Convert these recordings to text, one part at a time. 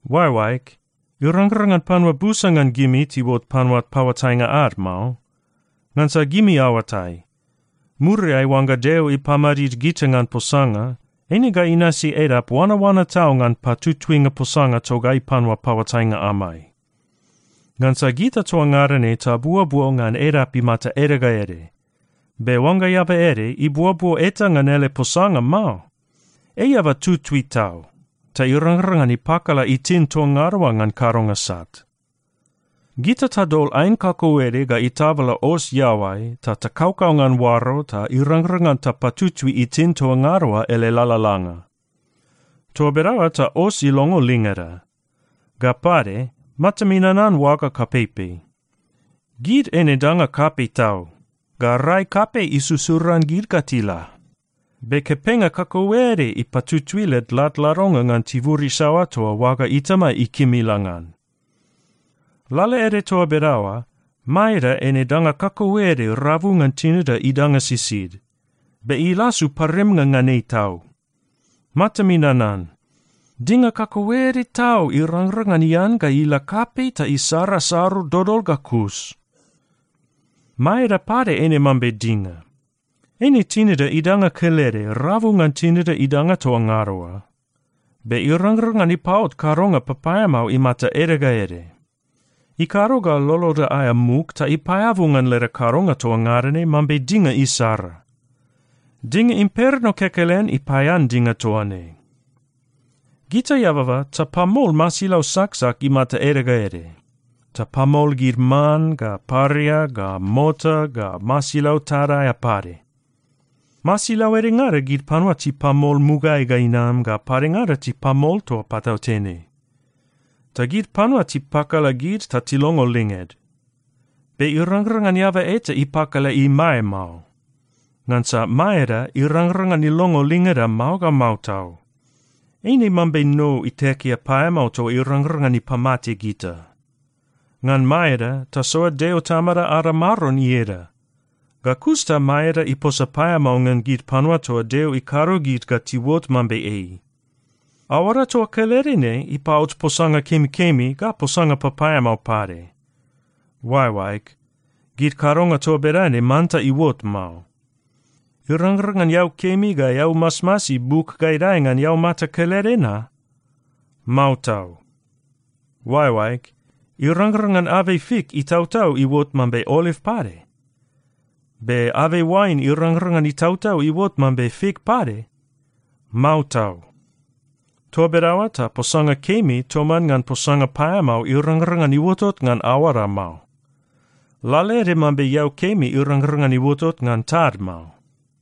Oaeoaeg, irangrang ngan panua busa ngan gimi tiuot panua paoatainga ad mao. Ngansa gimi aoatai, muriai oangga Deo ipamadid gita ngan posanga, eine ga inasi edap oanaoana tau ngan patutuinga posanga togai panua paoatainga amai. Ngansa gita toa ngada ne tabuobuo ngan edap imata ede ga ede. Be oangga eaba ede ibuobuo eta ngan ele posanga mao, ei eaba tutui tau, ta irangrang ngan ipakala itin toa ngada oa ngan kadonga sat. Gita tadol aen kakauede ga itabala os iaoai ta takaukau ngan oaro ta irangrang ngan tapatutui itin toa ngada oa ngan ele lalalanga. Toa bedaoa ta os ilongo lingeda. Ga pade matami nanan oaga kapeipei. Gid eine danga kapei tau ga rai kapei isusuran gid ga tila, be kepenga kakauede ipatutui led ladladonga ngan tibur isaoa toa oaga itama ikim ila ngan. Lalaede toa bedaoa, maeda eine danga kakauede rabu ngan tinida idanga sisid, be ilasu parimnga ngan ei tau. Matami nanan. Dinga kakauede tau irangrang ngan ian ga ila kapei ta isara saru dodol ga kus. Maeda pade eine mambe dinga. Eine tinida idanga kelede rabu ngan tinida idanga toa ngada oa, be irangrang ngan ipapot kadonga papaeamao imata ede ga ede. Ikado ga loloda aea muk ta ipaeabu ngan leda kadonga toa ngada ne mambe dinga isara. Dinga imperno kekelen ipaean dinga toa ne. Gita eababa tapamol masilau saksak imata ede ga ede. Tapamol gid man ga paria ga mota ga masilau tad aea pade. Masilau edengada, gid panua tipamol mugaeai ga inam, ga padengada tipamol toa patautene. Ta gid panua tipakala gid ta tilongo linged. Be irangrang ngan eaba eta ipakala imae mao. Ngansa maeda irangrang ngan ilongo lingeda mao ga mao tau. Eine mambe nou itekea paeamao toa irangrang ngan ipamate gita. Ngan maeda, tasoa Deo Tamada ada Maron ieda. Ga kus ta maeda iposa paeamao ngan gid panua toa Deo ikado gid ga tiuot mambe ei. Aoada toa kelede ne ipaot posanga kemikemi ga posanga papaeamao pade. Oaeoaeg, gid kadonga toa bedane manta iuot mao. Irangrang ngan eau kemi ga eau masmasi buk ga idae ngan eaumata kelede na? Mao tau! Oaeoaeg, irangrang ngan abei fik itautau iuot mambe oliv pade? Be abei oain irangrang ngan itautau iuot mambe fik pade? Mao tau! Toa bedaoa ta posanga kemi toman ngan posanga paeamao irangrang ngan iuotot ngan aoada mao, lalaede mambe eau kemi irangrang ngan iuotot ngan tad mao.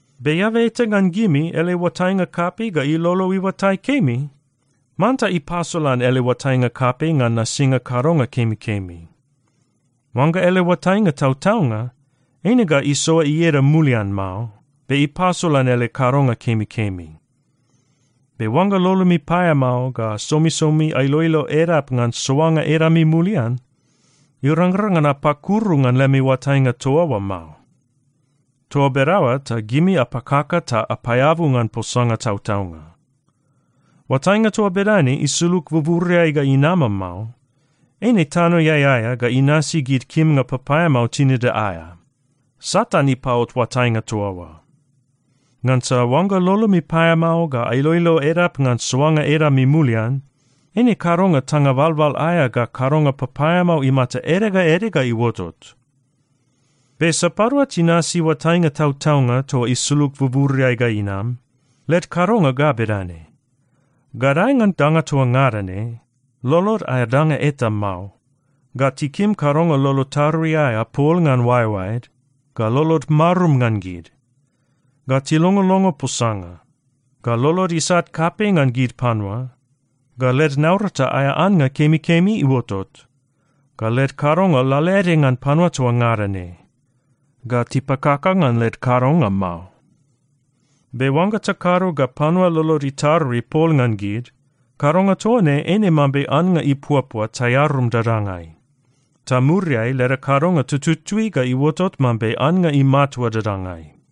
Be eaba eta ngan gimi ele oatainga kapei ga ilolo iuatai kemi? Manta ipasolan ele oatainga kapei ngan nasinga kadonga kemikemi. Oangga ele oatainga tautaunga, eine ga isoa ieda mulian mao, be ipasolan ele kadonga kemikemi. Be oangga lolomi paeamao ga somisomi ailoilo edap ngan soanga edami mulian, irangrang ngan apakuru ngan lemi oatainga toa oa mao. Toa bedaoa ta gimi apakaka ta apaeabu ngan posanga tautaunga. Oatainga toa bedane isulug buburiai ga inama mao. Eine tanoeai aea ga inasi gid kimnga papaeamao tinida aea. Satan ipaot oatainga toa oa. Ngansa oangga lolomi paeamao ga ailoilo edap ngan soanga edami mulian, eine kadonga tanga balbal aea ga kadonga papaeamao imata ede ga ede ga iuotot. Be sapadua tinasi oatainga tautaunga toa isulug buburiai ga inam, led kadonga ga bedane: gadae ngan danga toa ngada ne, lolod aea danga eta mao, ga tikim kadonga lolo tarui aea pol ngan oaeoaed, ga lolod marum ngan gid, ga tilongolongo posanga, ga lolod isat kapei ngan gid panua, ga led naurata aea annga kemikemi iuotot, ga led kadonga lalaede ngan panua toa ngada ne, ga tipakaka ngan led kadonga mao. Be oangga takado ga panua lolod itarui pol ngan gid, kadonga toa ne eine mambe annga ipuapua taearum dadangai. Ta muriai leda kadonga tututui ga iuotot mambe annga imatua dadangai.